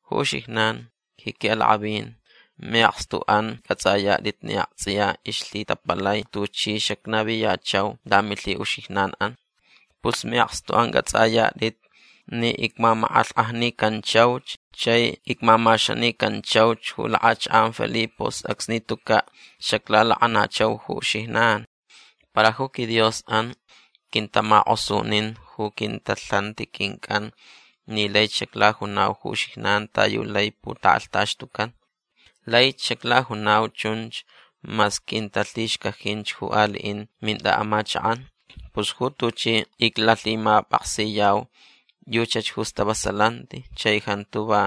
Ju uxijnan ji qui'alak'avin mi'akstu'an c'ats'ayat'it ni akts'iya ixlhitapalai tuchi xacnaviyachau lamilhi'uxijnan'an. Pus mi'akstu'an c'ats'ayat'it ni icmamak'alhk'ajnicanchauch chai icmamaxanicanchauch ju lak'achak'an Filipos acsni tuca' xaclalak'anachau ju uxijnan. Para ju quiDios'an quintamak'osunin ju quintalhanti quinc'an ni laich xaclajunau ju uxijnan ta yu lai putak'alhtaxtucan. Laich xaclajunau chunch mas quintalhixcajinch ju ali'in mint'a'amachak'an. Pus ju tuchi iclalhimap'aksiyau yuchach ju stavasalanti chai jantu va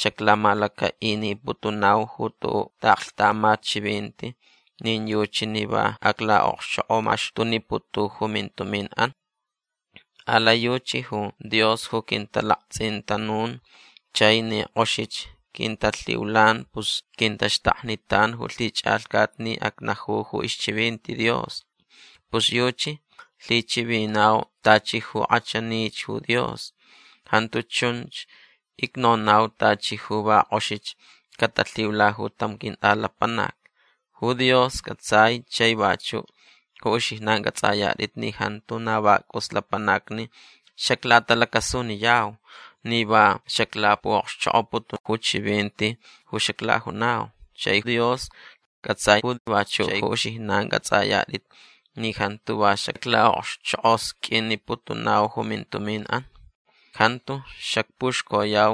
xaclamalaca'iniputunau ju tu'u' ta'aklhtamat chivinti nin yuchi ni va acla'okxchok'omaxtuniputu ju mintumin'an. Alai yuchi ju Dios ju quintalakts'intanun chai ni k'oxich quintalhiulan pus quintaxtaknitan ju lhich'alhcat ni acnaju ju ixchivinti Dios. Pus yuchi lhichivinau tachi ju k'achanich ju Dios. Jantu chun icnonau tachi ju va k'oxich catalhiula ju tam quint'alapanac. Ju Dios c'atsai chai vachu' ju uxijnan c'ats'ayat'it ni jantu na va c'us lapanacni xaclatalacasuniyau ni va xaclapu'okxchok'oputu ju chivinti ju xaclajunau. Chai Dios ju c'atsai chai vachu' ju uxijnan c'ats'ayat'it ni jantu va xacla'okxchok'osq'uiniputunau ju mintumin'an. Jantu xacpuxcoyau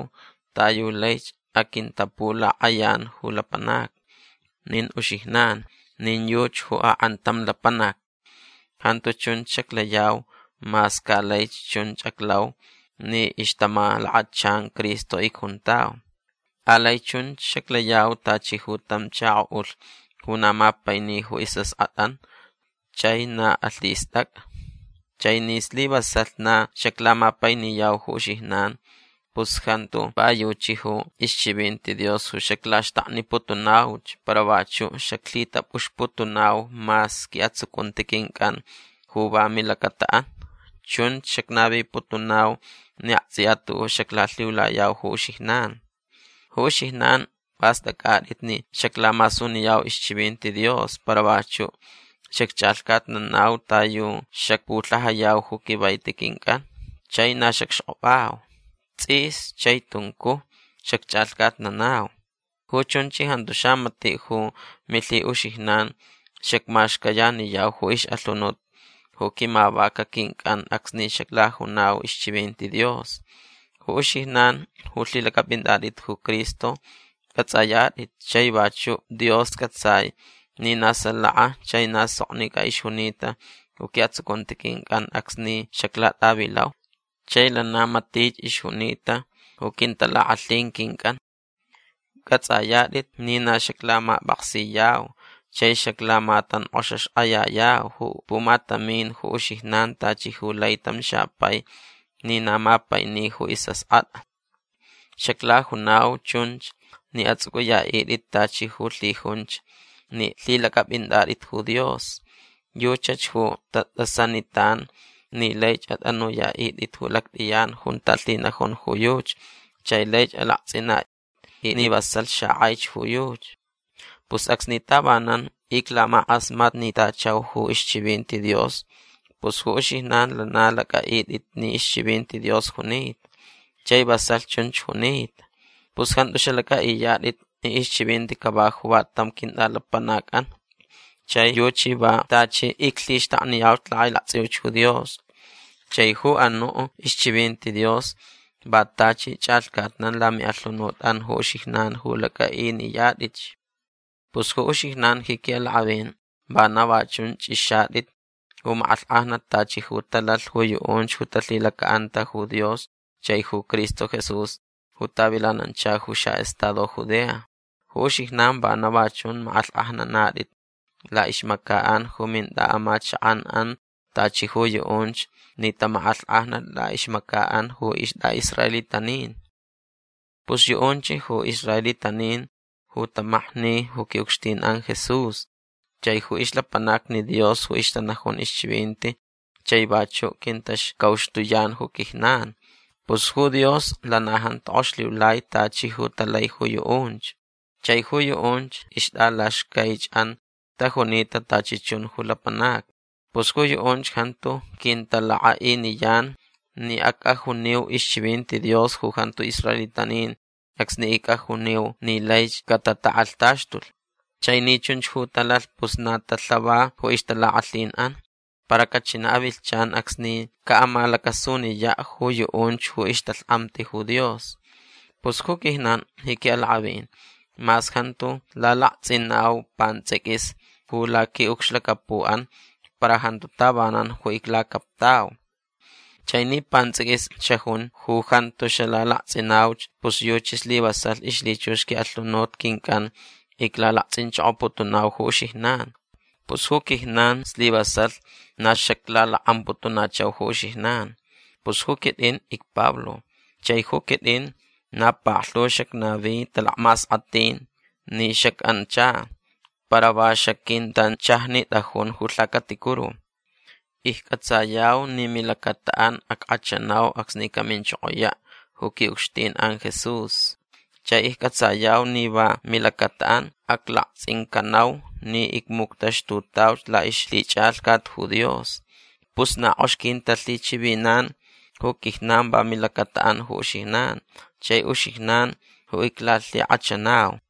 ta yu laich aquintapulak'ayan ju lapanacni. Nin uxijnan nin yuchi ju ak'antam lapanac. Jantu chunch xaclayau mas ca laich chunch aclau ni ixtamalakachan Cristo icjuntau. Alai chunch xaclayau tachi ju tam chako'ulh ju na mapaini ju is'ask'at'an chai na alhist'ac'a. Chai ni slivasalh na xaclamapainiyau ju uxijnan pus jantu va yuchi ju ixchivinti Dios ju xaclaxtakniputunauch para vachu' xaclhitap'uxputunau mas qui'atsucunti quinc'an ju va milacata'an. Chunch xacnaviputunau ni akts'iya tu'u' xaclalhiulayau ju uxijnan. Ju uxijnan p'ast'ac'at'it ni xaclamasuniyau ixchivinti Dios para vachu' xacch'alhcatnanau ta yu xacpulhajayau ju quivaiti quinc'an. Chai na xacxk'opau. Ts'is chai tuncuj xacch'alhcatnanau. Ju chunch jantu xamati' ju milhi'uxijnan xacmaxcayaniyau ju ix'alhunut ju quimavaca quinc'an acsni xaclajunau ixchivinti Dios. Ju uxijnan ju lhilac'ap'inat'it ju Cristo c'ats'ayat'it chai vachu' Dios c'atsai ni na salaka chai na soknic'a ixjunita ju qui'atsucunti quinc'an acsni xaclat'avilau. Chai lana matich ixjunita ju quintalak'alhin quinc'an. C'ats'ayat'it ni na xaclamap'aksiyau chai xaclamatank'oxaxk'ayayau ju pumatamin ju uxijnan tachi ju lai tam xapai ni na mapaini ju is'ask'at'a. Xaclajunau chunch ni ats'uc'uya'it'it tachi ju lhijunch ni lhilac'ap'int'at'it ju Dios. Yuchach ju tat'asanitan ni laich at'anuya'it'it ju lact'iyan junta lhinajun ju yuchi chai laich alakts'ina'it'it ni vasalh xak'aich ju yuchi. Pus acsni tavanan iclamak'asmatnitachau ju ixchivinti Dios pus ju uxijnan lana lac'a'it'it ni ixchivinti Dios junita. Chai vasalh chunch junita. Pus jantu xalac'a'iyat'it ni ixchivinti cava ju va tam quint'alapanac'an. Chai yuchi va tachi iclhixtakniyau lak'ailakts'iuch ju Dios. Chai ju anu' ixchivinti Dios va tachi ch'alhcatnan lami'alhunut'an ju uxijnan ju lac'a'iniyat'itch. Pus ju uxijnan ji qui'alak'avin vana va chun ch'ixat'it ju mak'alhk'ajnat tachi ju talalh ju yu'unch ju talhilaca'anta ju Dios chai ju Cristo Jesús ju tavilanancha ju xa'estado Judea. Ju uxijnan vana va chun mak'alhk'ajnanat'it la'ixmaca'an ju mint'a'amachak'an'an tachi ju yu'unch ni tamak'alhk'ajnalh la'ixmaca'an ju ist'a'israelitanin. Pus yu'unch ju israelitanin ju tamakni ju qui'ucxtin'an Jesús chai ju ixlapanacni Dios ju ixtanajun ixchivinti chai vachu' quintaxcauxtuyan ju quijnan. Pus ju Dios lana jantu k'ox lhiulai tachi ju talai ju yu'unch. Chai ju yu'unch ixt'alaxcaich'an tajunita tachi chun ju lapanacni. Pus ju yu'unch jantu quintalak'a'iniyan ni ac'ajuniu ixchivinti Dios ju jantu israelitanin acsni ic'ajuniu ni laich catatak'alhtaxtulh. Chai ni chunch ju talalh pus na talhava ju ixtalak'alhin'an. Para cachina' avilhchan acsni ca'amalacasuniya' ju yu'unch ju ixtalhk'amti ju Dios. Pus ju quijnan ji qui'alak'avin mas jantu lalakts'inau pants'iquis ju laqui'ucxlacapu'an para jantu tavanan ju iclacaptau. Chai ni pants'iquis xajun ju jantu xalalakts'inauch pus yuchi slivasalh ixlhichux qui'alhunut quinc'an iclalakts'inchokoputunau ju uxijnan. Pus ju quijnan slivasalh na xaclalak'amputunachau ju uxijnan. Pus ju quit'in icPablo chai ju quit'in na paklhu xacnavi talakmask'atinti ni xac'ancha. Para va xaquintanchajnit'ajun ju lhacaticuru. Icc'atsayau ni milacata'an ack'achanau acsni caminchokoya' ju qui'ucxtin'an Jesús. Chai icc'atsayau ni va milacata'an aclakts'incanau ni icmuctaxtutauch la'ixlhich'alhcat ju Dios. Pus na k'ox quintalhichivinan ju quijnan va milacata'an ju uxijnan. Chai uxijnan ju iclalhik'achanau.